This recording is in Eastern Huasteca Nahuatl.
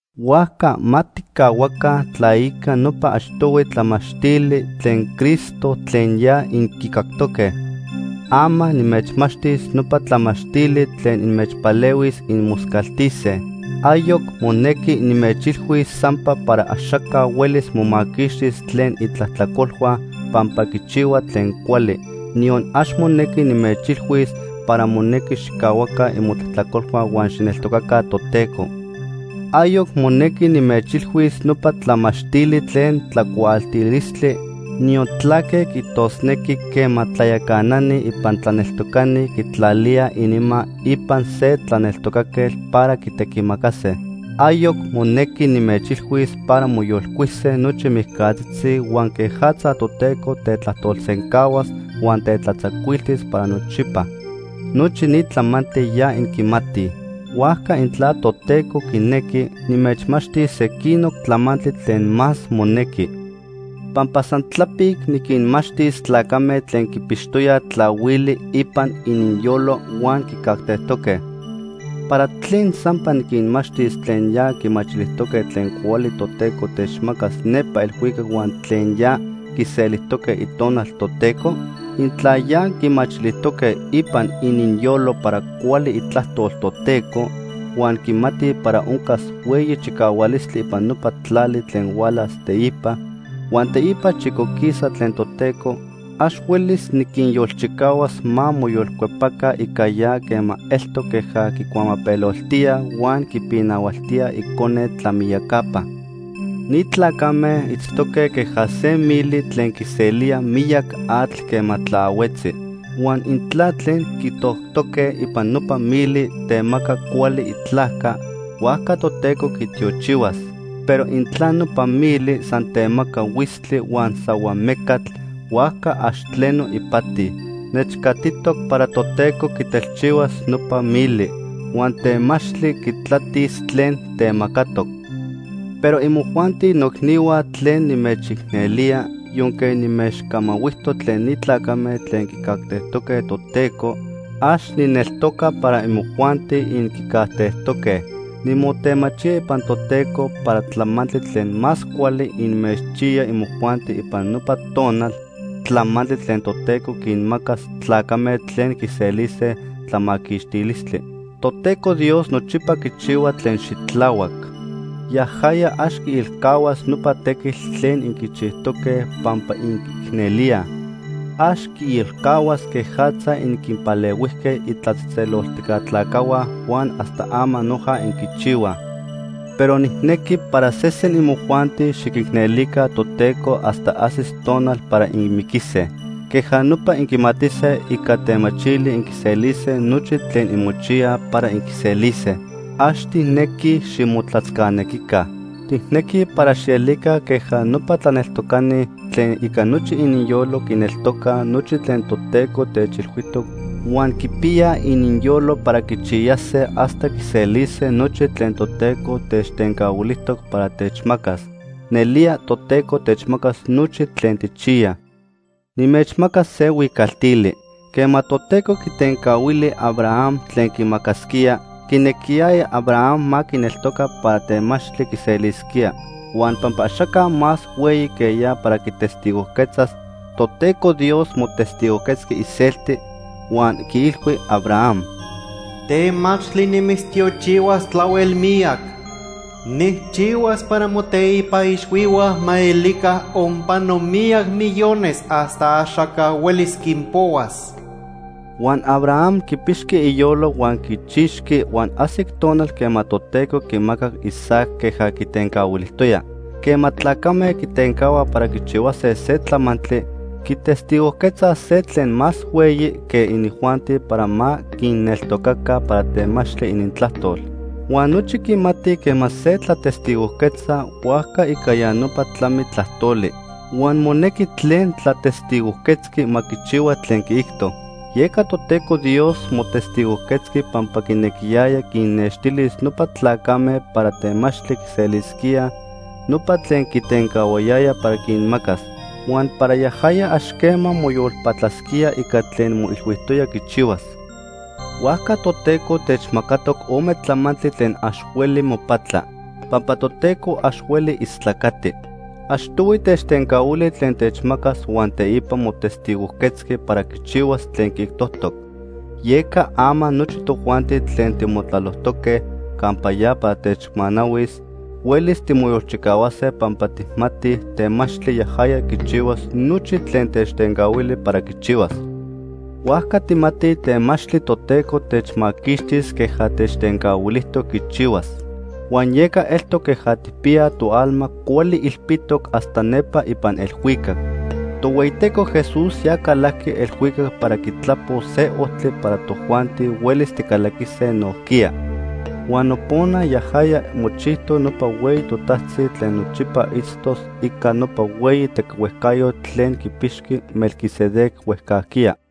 Huajca ma tijcahuaca tlaica nopa achtohui tlamachtili tlen Cristo tlen ya inquicactoque. Ama nimechmachtis nopa tlamachtili tlen inmechpalehuis inmoscaltise. Ayoc monequi nimechilhuis sampa para axaca huelis momaquixtis tlen itlajtlacolhua pampa quichihua tlen cuali, niyon ax monequi nimechilhuis para monequi xijcahuaca imotlajtlacolhua huan xijneltocaca Toteco. Ayoc monequi nimechilhuis nopa tlamachtili tlen tlacuaaltilistli, niyon tlaque quiijtosnequi quema tlayacanani ipan tlaneltocani quitlalíaj ininma ipan se tlaneltocaquetl para quitequimacase. Ayoc monequi nimechilhuis para moyolcuise nochi mijcatzitzi huan quejatza Toteco tetlajtolsencahuas huan tetlatzacuiltis para nochipa. Nochi ni tlamantli ya inquimatij. Huajca intla Toteco quinequi, nimechmachtis sequinoc tlamantli tlen más monequi. Pampa san tlapic niquinmachtis tlacame tlen quipixtoyaj tlahuili ipan ininyolo huan quicajtejtoque. ¿Para tlen sampa niquinmachtis tlen ya quimachilijtoque tlen cuali Toteco techmacas nepa elhuicac huan tlen ya quiselijtoque Itonal Toteco? Intla ya quimachilijtoque ipan ininyolo para cuali itlajtol Toteco, huan quimatij para oncas hueyi chicahualistli ipan nopa tlali tlen hualas teipa, huan teipa chicoquisaj tlen Toteco, ax huelis niquinyolchicahuas ma moyolcuepaca ica ya quema eltoc queja quicuamapeloltíaj huan quipinahualtíaj Icone tlamiyacapa. Ni tlacame itztoque queja se mili tlen quiselía miyac atl quema tlaahuetzi. Huan intla tlen quitoctoque ipan nopa mili temaca cuali itlajca, huajca Toteco quitiochihuas. Pero intla nopa mili san temaca huitztli huan sahuamecatl, huajca ax tleno ipati. Nechcatitoc para Toteco quitelchihuas nopa mili. Huan temachtli quitlatis tlen temacatoc. Pero imojuanti noicnihua tlen nimechicnelía, yonque nimechcamahuijtoc tlen ni tlacame tlen quicajtejtoque Toteco, ax nijneltoca para imojuanti inquicajtejtoque. Nimotemachía ipan Toteco para tlamantli tlen más cuali inmechchiya imojuanti ipan nopa tonal, tlamantli tlen Toteco quinmacas tlacame tlen quiselise tlamaquixtilistli. Toteco Dios nochipa quichihua tlen xitlahuac. Yajaya ax quiilcahuas nopa tequitl tlen inquichijtoque pampa inquiicnelíaj. Ax quiilcahuas quejatza inquinpalehuijque itlatzejtzeloltijca tlacajhua huan hasta ama noja inquichihuaj. Pero nijnequi para sesen imojuanti xiquicnelica Toteco hasta ajsis tonal para inmiquise. Queja nopa inquimatise ica temachili inquiselise nochi tlen inmochiyaj para inquiselise. Ax tijnequij ximotlatzcanequica. Tijnequij para xielica queja nopa tlaneltocani tlen ica nochi ininyolo quineltocaj nochi tlen Toteco techilhuijtoc huan quipiyaj ininyolo para quichiyase hasta quiselise nochi tlen Toteco techtencahuilijtoc para techmacas. Nelía Toteco techmacas nochi tlen tijchiyaj. Nimechmacas se huicaltili. Quema Toteco quitencahuili Abraham tlen quimacasquía, quinequiyaya Abraham ma quineltoca para temachtli quiselisquía. Huan pampa axaca más hueyi que ya para quitestigojquetzas, Toteco Dios motestigojquetzqui iselti, huan quiilhui Abraham: “Temachtli nimitztiochihuas tlahuel miyac. Nijchihuas para moteipa ixhuihua ma elica onpano miyac millones hasta axaca huelis quinpohuas.” Huan Abraham quipixqui iyolo huan quichixqui huan ajsic tonal quema Toteco quimacac Isaac queja quitencahuilijtoya. Quema tlacame quitencahuaj para quichihuase se tlamantli, quitestigojquetzaj se tlen más hueyi que inijuanti para ma quinneltocaca para temachtli inintlajtol. Huan nochi quimatij quema se tlatestigojquetza huajca ica ya nopa tlami tlajtoli huan monequi tlen tlatestigojquetzqui ma quichihua tlen quiijto. Yeca Toteco Dios motestigojquetzqui pampa quinequiyaya quinnextilis nopa tlacame para temachtli quiselisquíaj nopa tlen quitencahuayaya para quinmacas, huan para yajaya ax quema moyolpatlasquía ica tlen moilhuijtoya quichihuas. Huajca Toteco techmacatoc ome tlamantli tlen ax hueli mopatla, pampa Toteco ax hueli istlacati. Achtohui techtencahuili tlen techmacas huan teipa motestigojquetzqui para quichihuas tlen quiijtojtoc. Yeca ama nochi tojuanti tlen timotlalojtoque campa ya para techmanahuis, huelis timoyolchicahuase pampa tijmatij temachtli yajaya quichihuas nochi tlen techtencahuili para quichihuas. Huajca tijmatij temachtli Toteco techmaquixtis queja techtencahuilijtoc quichihuas. Huan yeca eltoc queja tijpiyaj toalma cuali ilpitoc hasta nepa ipan elhuicac. Tohueyiteco Jesús ya calajqui elhuicac para quitlapos se ojtli para tojuanti huelis ticalaquise nojquiya. Huan nopona yajaya mochijtoc nopa hueyi totajtzi tlen nochipa itztos ica nopa hueyi tequihuejcayotl tlen quipixqui Melquisedec huejcajquiya.